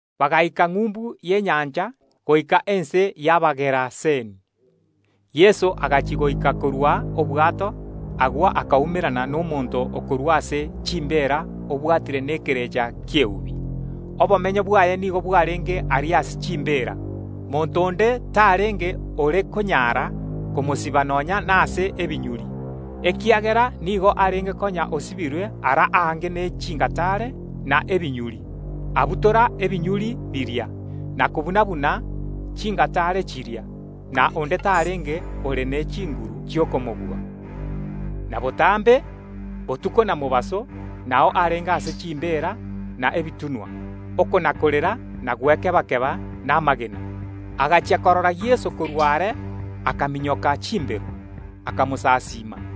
Bagaika ng’umbu y’enyancha, goika ense y’Abageraseni. Yeso agachia goika korwa obwato; agwo akaumerana nomonto okorwa ase chimbeera obwatire nekerecha ki’eubi. Obomenyo bwaye nigo bwarenge aria ase chimbeera. Monto onde tarenge ore konyara komosiba nonya nase ebinyuri, ekiagera nigo arenge konya osibirwe ara aange ne chingataare na ebinyuri, abibutora ebinyuri biria, na kobuna‐buna chingataare chiria, na onde tarenge ore ne chinguru chi’okomobua. Na botambe, botuko na mobaso, nao arenge ase chimbeera na ebitunwa, okona‐korera na gwekeba‐keba namagena. Agachia korora Yeso korwa are, akaminyoka chimbero, akamosasiima;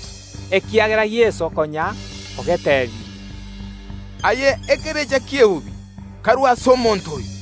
ekiagera Yeso konya ogetebirie, “Aye ekerecha ki’eubi, karwe ase omonto oyo!”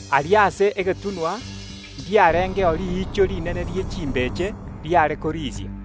Aria ase egetunwa ndiarengeo riicho rinene rie chimbeche riare korisia.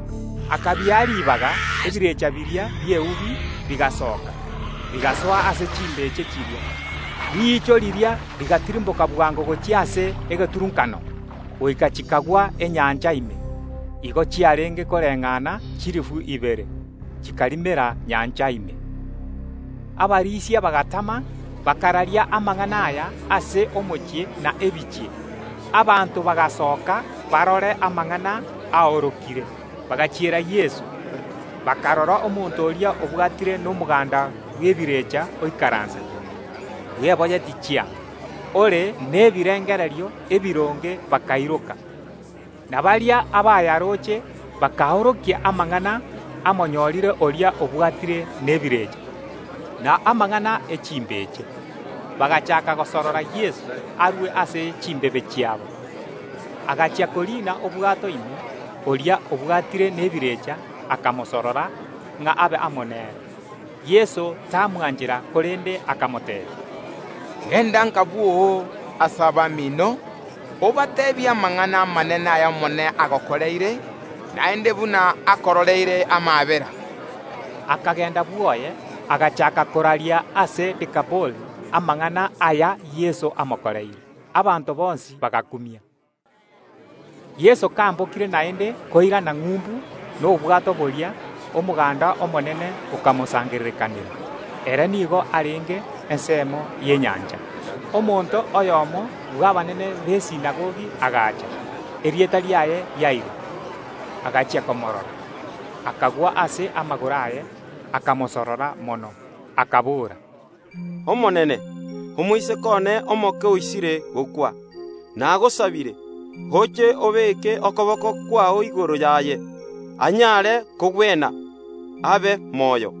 Akabia ribaga. Ebirecha biria bi’eubi bigasoka, bigasoa ase chimbeche chiria; riicho riria rigatirimboka bwango gochia ase egeturunkano, goika chikagwa enyancha ime. Igo chiarenge koreng’ana chilifu ibere, chikarimera nyancha ime. Abarisia bagatama, bakararia amang’ana aya ase omochie na ebinyoro. Abanto bagasooka barore amang’ana aorokire. Bagachiera Yeso, bakarora omonto oria obwatire nomoganda bw’ebirecha oikaransete, bweboyetie chianga, ore nebirengererio ebironge bakairoka. Na baria abayaroche bakaorokia amang’ana amonyorire oria obwatire nebirecha, na amang’ana ye chimbeche. Bagachaaka gosorora Yeso arue ase ense yabo. Ekero Yeso achia koriina obwato ime, oria obwatire nebirecha akamosorora ng’a abe amo nere. Yeso tamwanchera, korende akamoteebia, “Genda nka bwoo ase abamino, obateebie amang’ana amanene ay’Omonene agokoreire, naende buna akororeire amaabera.” Akagenda bwoye, agachaaka koraria ase Dekapoli amang’ana aya Yeso amokoreire. Abanto bonsi bagakumia. Yeso kambokire naende koirana ng’umbu nobwato boria, omoganda omonene okamosangererekanera; ere nigo arenge ensemo y’enyancha. Omonto oyomo bw’abanene b’esinagogi agacha, erieta riaye Yairo. Agachia komoorora, akagwa ase amagoro aye, akamosorora mono, akabora, “Omonene, omoiseke one omoke oisire gokwa. Nagosabire, oche obeke okoboko kwao igoro yaye, anyare kogwena, abe moyo.”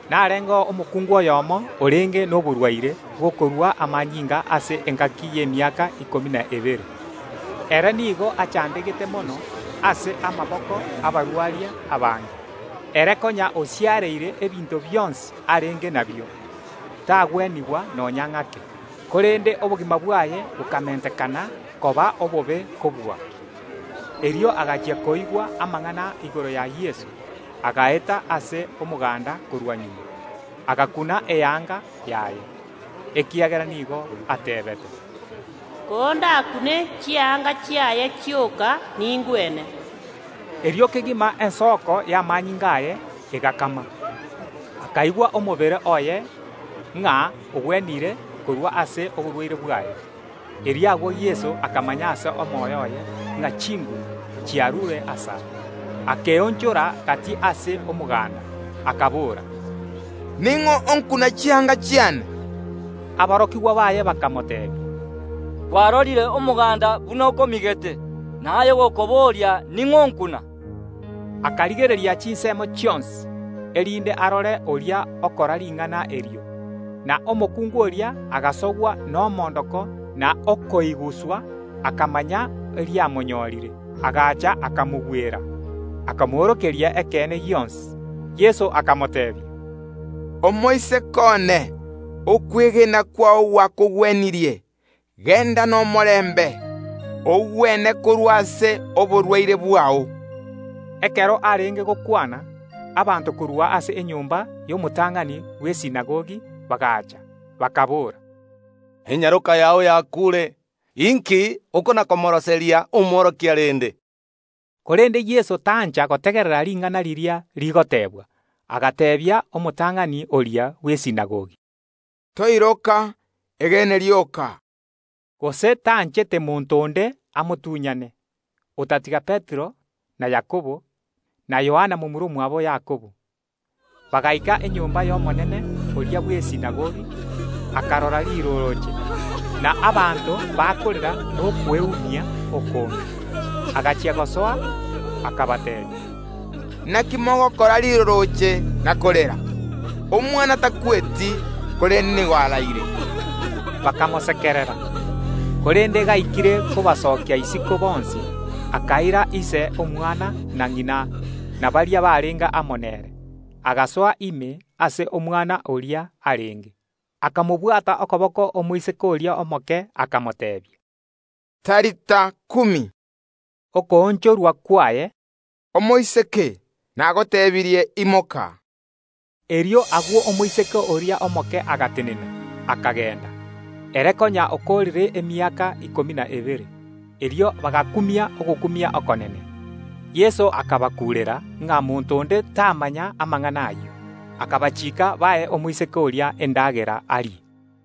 Narengeo omokungu oyomo orenge noborwaire bw’okorua amanyinga ase engaki y’emiaka ikomi na ebere. Ere nigo achandegete mono ase amaboko y’abarwaria abange. Ere konya osiareire ebinto bionsi arenge nabio, tagwenigwa nonya ng’ake, korende obogima bwaye bokamentekana koba obobe kobua. Konya oigure amang’ana igoro ya Yeso, agaeta ase omoganda korwa magega, agakuna eanga yaye, ekiagera nigo ateebete, “Kondakune chianga chiaye chioka, ningwene.” Erio kegima ensoko y’amanyinga aye egakama: akaigwa omobere oye ng’a ogwenire korwa ase oborwaire bwaye. Erio agwo Yeso akamanya ase omoyo oye ng’a chinguru chiarure asare, akeonchora gati ase omoganda, akabora, “Ning’o okuna chianga chiane?” Aborokigwa baye bakamoteebia, “Norooche omoganda oyo buna okomigete, na aye gokoboria: Ning’o onkuna?” Korende Yeso akarigereria chinsemo chionsi, erinde arore oria okora ring’ana erio. Na omokungu oria agasogwa nomoondoko na okoiguswa, akamanya eriamonyorire, agacha akamogwera, akamoorokeria ekeene gionsi. Yeso akamoteebia, “Omoiseke one, okwegena kwao gwakogwenirie, genda nomorembe, ogwene korwa ase oborwaire bwao.” Ekero Yeso agendererete gokwana, abanto korwa ase enyomba y’omotang’ani bw’esinagogi bagaacha, bakaboora, “Enyaroka yao yakuure. Inki okona‐koroseria Omworokia rende?” Korende Yeso tancha gotegerera ring’ana riria rigotebwa, agateebia omotang’ani oria bw’esinagogi, “Toiroka, egene rioka.” Gose tanchete monto onde amotuny’ane, otatiga Petero, na Yakobo, na Yohana momura omwabo Yakobo. Bagaika enyomba y’omonene oria bw’esinagogi; akarora rirorooche, na abanto bakorera nokweumia okonge. Agachia gosoa, akabateebia, “Inaki mogokora rirorooche na korera? Omwana takweti, korende nigo araire.” Bakamosekerera. Korende gaikire kobasokia isiko bonsi, akaira ise omwana, na ng’ina, na aborokigwa baye batato abwo barenge amo nere, agasoa ime ase omwana oria arenge. Akamobwata okoboko omoiseke oria omoke, akamoteebia, “Talitha kumi”, okoonchorwa kwaye, “Tenena aye enyaroka.” Erio agwo omoiseke oria omoke akaimoka akagenda, ere konya okoorire emiaka ikomi na ebere. Erio bagakumia ogokumia okonene. Yeso akabakuurera ng’a monto onde tamanya amang’ana ayio, akabachiika bae omoiseke oria endagera arie.